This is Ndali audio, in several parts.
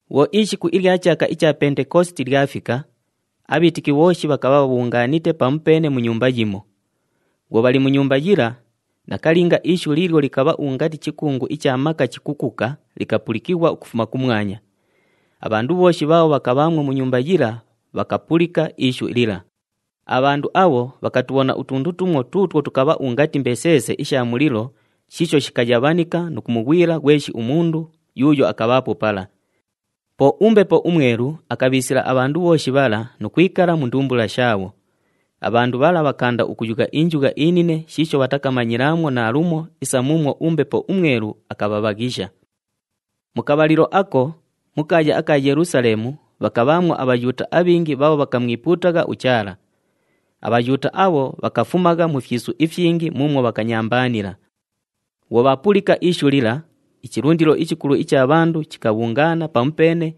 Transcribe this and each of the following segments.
Bhwo ishiku ilya chaaka icha Pentekositi lyafika, abhiitiki bhooshi bhakabha bhabhungaanite pamupeene mu nyumba yimo. Bhwo bhali mu nyumba yila, nakalinga ishu liilyo likabha ungati chikungu icha maka chikukuka likapulikighwa ukufuma kumwanya. Abhandu bhooshi bhaabho bhakabhaamwo mu nyumba yila bhakapulika ishu lila. Abhandu abho bhakatubhona utundu tumo tuutwo tukabha ungati mbeseese isha mulilo shiisho shikayabhanika nu kumughwila ghweshi umundu yuuyo akabhaapo pala. Po uMbepo uMwelu akabhiisila abhandu bhooshi bhala nu kwikala mu ndumbula shaabho. Abhandu bhala bhakaanda ukuyugha injugha inine shiisho bhatakamanyilaamwo naalumo isa muumwo uMbepo uMwelu akabhabhaghisha. Mu kabhalilo ako, mu kaaya aka Yelusaleemu bhakabhaamwo aBhayuuta abhingi bhaabho bhakamwipuutagha uChaala. ABhayuuta abho bhakafumagha mu fyisu ifyingi muumwo bhakanyambaanila. Bhwo bhaapulika ishu lila, ichilundilo ichikulu icha bhandu chikabhungaana pamupeene,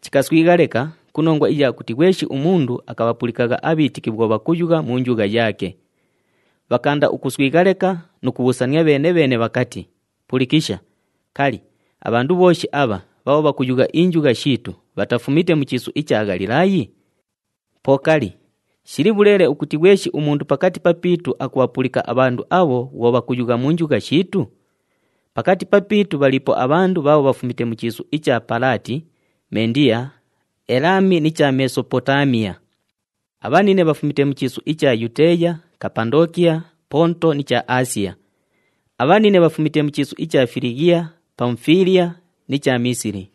chikaswigha leka ku nongwa iya kuti ghweshi umundu akabhapulikagha abhiitiki bhwo bhakuyugha mu njugha yaake. Bhakaanda ukuswigha leka nu kubhuusania bheene-bheene bhakati, “Pulikisha! Kali, abhandu bhooshi abha bhaabho bhakuyugha injugha shiitu bhatafumite mu chiisu icha Ghalilaayi? Po kali, shili bhuleele ukuti ghweshi umundu pakati papiitu akubhapulika abhandu abho bhwo bhakuyugha mu njugha shiitu? Pakati papiitu bhaliipo abhandu bhaabho bhafumite mu chiisu icha Palaati, Mendiya, Elaami ni cha Mesopotaamiya. Abhanine bhafumite mu chiisu icha Yuteeya, Kapandookiya, Ponto ni cha Aasiya. Abhanine bhafumite mu chiisu icha Filighiya, Pamufiiliya ni cha Miisili.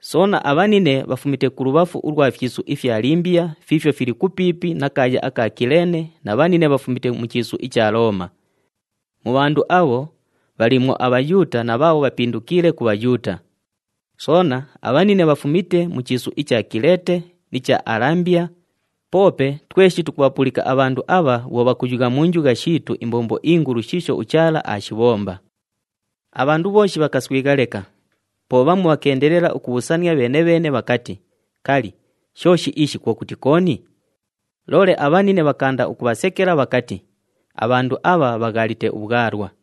Soona, abhanine bhafumite kulubhafu ulwa fyisu ifya Limbiya fiifyo fili kupiipi na kaaya aka Kileene na bhanine bhafumite mu chiisu icha Looma. Mu bhandu abho, bhaliimwo aBhayuuta na bhaabho bhapindukiile ku Bhayuuta. Soona, abhanine bhafumite mu chiisu icha Kileete ni cha Alambiya, poope tweshi tukubhapulika abhandu abha bhwo bhakuyugha mu njugha shiitu imbombo ingulu shiisho uChaala aashibhomba.” Abhandu bhooshi bhakaswigha leka. Po bhamu bhakeendelela ukubhuusania bheene-bheene bhakati, “Kali, shooshi ishi kwo kuti kooni?” Loole abhanine bhakaanda ukubhasekela bhakati, “Abhandu abha bhaghaalite ubhwalwa!”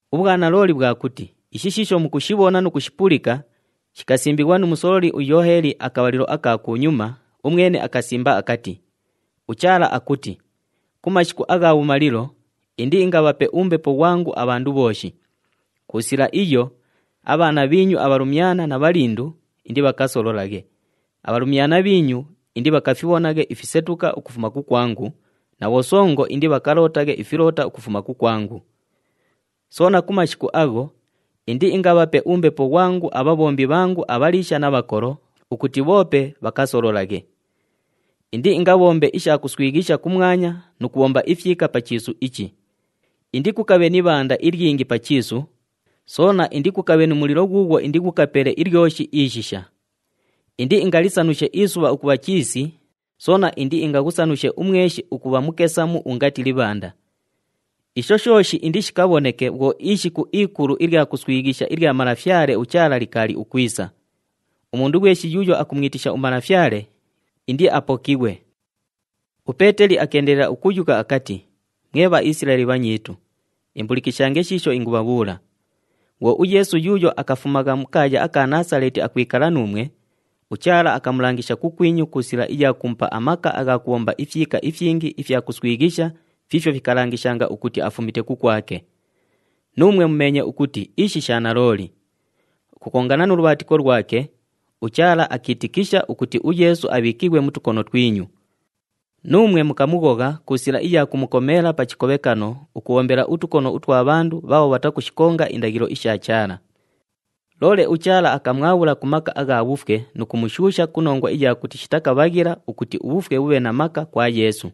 Ubhwanalooli bhwa kuti ishi shiisho mukushibhona nu kushipulika shikasimbighwa nu musololi uYooheli akabhalilo aka kunyuma, umwene akasimba akati, “UChaala akuti, ‘Ku mashiku agha bhumalilo, indiingabhape uMbepo ghwangu abhandu bhooshi. Ku sila iyo, abhaana bhiinyu abhalumyana na bhalindu indibhakasololaghe, abhalumyana bhiinyu indibhakafibhonaghe ifisetuka ukufuma kukwangu na bhosongo indibhakalootaghe ifiloota ukufuma kukwangu. Soona ku mashiku agho, indiingabhape uMbepo ghwangu abhabhombi bhangu abhaliisha na bhakolo ukuti bhoope bhakasololaghe. Indiingabhombe isha kuswighisha kumwanya nu kubhomba ifyika pa chiisu ichi. Indikukabhe ni ibhanda ilyingi pa chiisu, soona indikukabhe nu mulilo ghuughwo indighukapele ilyoshi ishisha. Indiingalisanushe isubha ukubha chiisi, soona indiingaghusanushe umweshi ukubha mukesamu ungati libhanda. Isho shooshi indishikabhoneke bhwo ishiku ikulu ilya kuswighisha ilya Malafyale uChaala likaali ukwisa. Umundu ghweshi yuuyo akumwitisha uMalafyale, indiapokighwe.’” UPeeteli akeendelela ukuyugha akati, “Mwe Bhaisilaeli bhanyiitu, imbulikishange shiisho ingubhabhuula! Bhwo uYeesu yuuyo akafumagha mu kaaya aka Naasaleeti akwikala nuumwe, uChaala akamulangisha kukwinyu ku sila iya kumupa amaka agha kubhomba ifyika ifyingi ifya kuswighisha fiifyo fikalangishanga ukuti afumite kukwake. Nuumwe mumeenye ukuti ishi sha nalooli. Ukukongana nu lubhaatiko lwake, uChaala akiitikisha ukuti uYeesu abhiikighwe mu tukono twinyu. Nuumwe mukamughogha ku sila iya kumukomeela pa chikobhekano ukubhombela utukono utwa bhandu bhaabho bhatakushikonga indaghilo isha Chaala. Loole uChaala akamwabhula ku maka agha bhufwe nu kumushuusha ku nongwa iya kuti shitakabhaghila ukuti ubhufwe bhubhe na maka kwa Yeesu.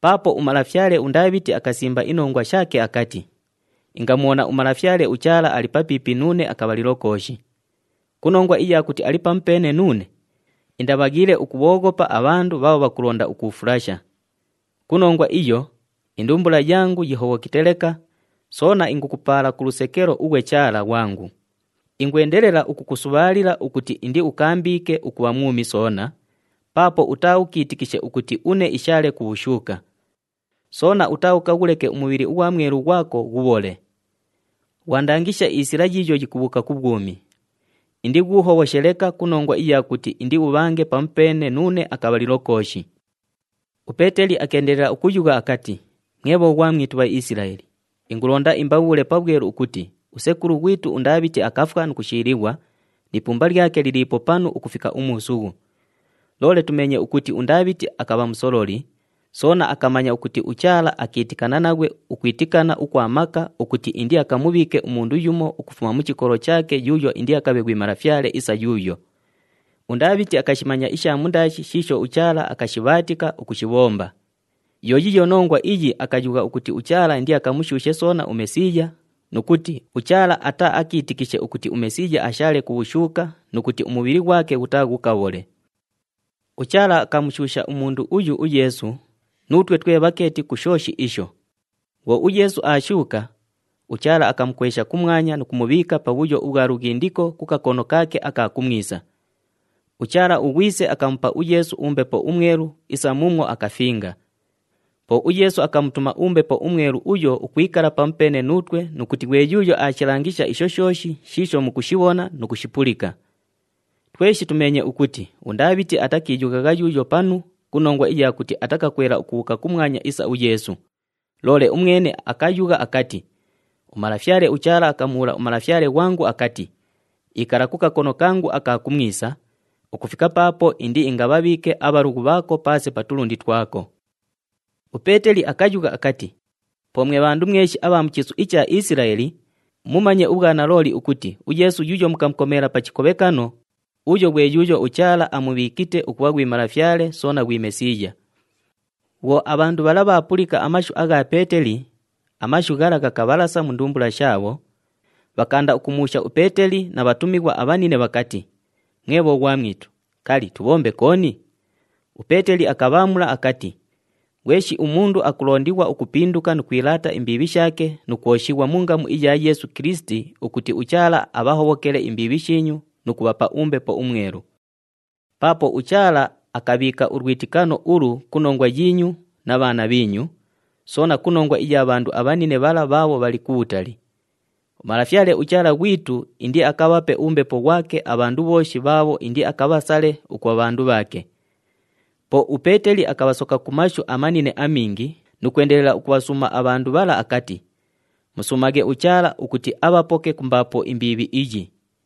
Paapo umalafyale uNdaabhiti akasimba inongwa shaake akati, ‘Ingamubhona uMalafyale uChaala ali papiipi nuune akabhalilo kooshi. Ku nongwa iya kuti ali pamupeene nuune, indabhaghiile ukubhooghopa abhandu bhaabho bhakulonda ukuufulasha. Ku nongwa iyo, indumbula yangu yihobhokite leka, soona ingukupaala ku lusekelo ughwe Chaala ghwangu. Ingwendelela ukukusubhaalila ukuti indiukaambiike ukubha mwumi soona, paapo utaaukiitikishe ukuti une ishaale ku bhushuuka. Soona utaaukaghuleke umubhili ughwa Mwelu ghwako ghubhole. Ghwandangisha isila yiiyo yikubhuuka ku bhwumi. Indighuuhobhoshe leka ku nongwa iya kuti indiubhange pamupeene nuune akabhalilo kooshi.’” UPeeteli akeendelela ukuyugha akati, “Mwe bhoghwamwitu, Bhaisilaeli, ingulonda imbabhuule pabhwelu ukuti usekulu ghwitu uNdaabhiti akafwa nu kushiilighwa, ni ipumba lyake liliipo panu ukufika umuusughu. Loole tumeenye ukuti uNdaabhiti akabha musololi, soona akamanya ukuti uChaala akiitikana naghwe ukwitikana ukwa maka ukuti indiakamubhiike umundu yumo ukufuma mu chikolo chaake yuuyo indiakabhe ghwi malafyale isa yuuyo. UNdaabhiti akashimanya isha mundaashi shiisho uChaala akashibhaatika ukushibhomba. Yo yiiyo nongwa iyi akayugha ukuti uChaala indiakamushuushe soona uMesiiya, nu kuti, ‘UChaala ataaakiitikishe ukuti uMesiiya ashaale ku bhushuuka nu kuti umubhili ghwake ghutaaghukabhole.’” “UChaala akamushuusha umundu uyu uYeesu, nuutwe twe bhakeeti ku shooshi isho. Bhwo uYeesu aashuuka, uChaala akamukwesha kumwanya nu kumubhiika pabhuyo ubhwa lughindiko ku kakono kaake aka kumwisa. UChaala uGhwise akamupa uYeesu uMbepo uMwelu isa muumwo akafinga. Po uYeesu akamutuma uMbepo uMwelu uyo ukwikala pamupeene nuutwe nu kuti ghwe yuuyo aashilangisha isho shooshi shiisho mukushibhona nu kushipulika. Tweshi tumeenye ukuti uNdaabhiti atakiiyughagha yuuyo panu ku nongwa iya kuti atakakwela ukubhuuka kumwanya isa uYeesu, loole umwene akayugha akati, ‘UMalafyale uChaala akamubhuula uMalafyale ghwangu akati, “Ikala kakono kangu aka kumwisa, ukufika paapo indiingabhabhiike abhalughu bhaako paase pa tulundi twako.”’” UPeeteli akayugha akati, “Po mwe bhandu mweshi abha mu chiisu icha Isilaeli, mumanye ubhwanalooli ukuti uYeesu yuuyo mukamukomeela pa chikobhekano, uyo ghwe yuuyo uChaala amubhiikite ukubha ghwi Malafyale soona ghwi Mesiiya.” Bhwo abhandu bhala bhaapulika amashu agha Peeteli, amashu ghala ghakabhalasa mu ndumbula shaabho, bhakaanda ukumubhuusha uPeeteli na bhatumighwa abhanine bhakati, “Mwe bhoghwamwitu, kali, tubhombe kooni?” UPeeteli akabhaamula akati, “Ghweshi umundu akulondighwa ukupinduka nu kwilaata imbiibhi shaake nu kwoshighwa mu ngamu iya Yeesu Kilisiti ukuti uChaala abhahobhokele imbiibhi shiinyu nu kubhapa uMbepo uMwelu. Paapo uChaala akabhiika ulwitikano ulu ku nongwa yiinyu na bhaana bhiinyu, soona ku nongwa iya bhandu abhanine bhala bhaabho bhali kubhutali. UMalafyale uChaala ghwitu indiakabhape uMbepo ghwake abhandu bhooshi bhaabho indiakabhasale ukubha bhandu bhaake.” Po uPeeteli akabhasoka ku mashu amanine amingi nu kwendelela ukubhasuuma abhandu bhala akati, “Musuumaghe uChaala ukuti abhapoke ku mbaapo imbiibhi iyi.”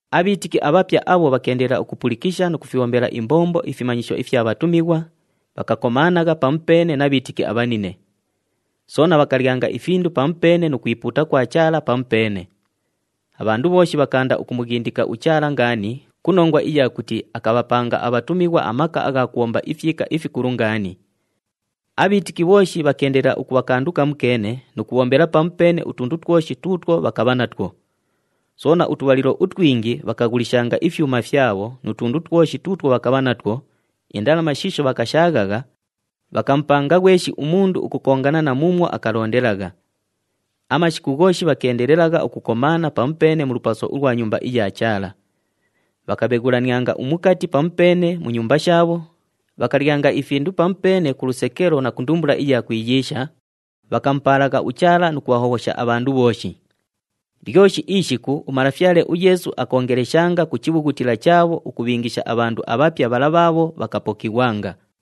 Abhiitiki abhapya abho bhakeendelela ukupulikisha nu kufibhombela imbombo ifimanyisho ifya bhatumighwa, bhakakomaanagha pamupeene na bhiitiki abhanine. Soona bhakalyanga ifindu pamupeene nu kwipuuta kwa Chaala pamupeene. Abhandu bhooshi bhakaanda ukumughindika uChaala ngaani ku nongwa iya kuti akabhapanga abhatumighwa amaka agha kubhomba ifyika ifikulu ngaani. Abhiitiki bhooshi bhakeendelela ukubha kandu kamukeene nu kubhombela pamupeene utundu twoshi tuutwo bhakabha natwo. Soona utubhalilo utwingi bhakaghulishanga ifyuma fyabho nu tundu twoshi tuutwo bhakabha natwo, indalama shiisho bhakashaaghagha, bhakamupanga ghweshi umundu ukukongana na muumwo akalondelagha. Amashiku ghooshi bhakeendelelagha ukukomaana pamupeene mu lupaso ulwa Nyumba iya Chaala. Bhakabheghulanianga umukati pamupeene mu nyumba shaabho, bhakalyanga ifindu pamupeene ku lusekelo na ku ndumbula iya kwiyiisha, bhakamupaalagha uChaala nu kubhahobhosha abhandu bhooshi. Lyoshi ishiku uMalafyale uYeesu akoongeleshanga ku chibhughutila chaabho ukubhiingisha abhandu abhapya bhala bhaabho bhakapokighwanga.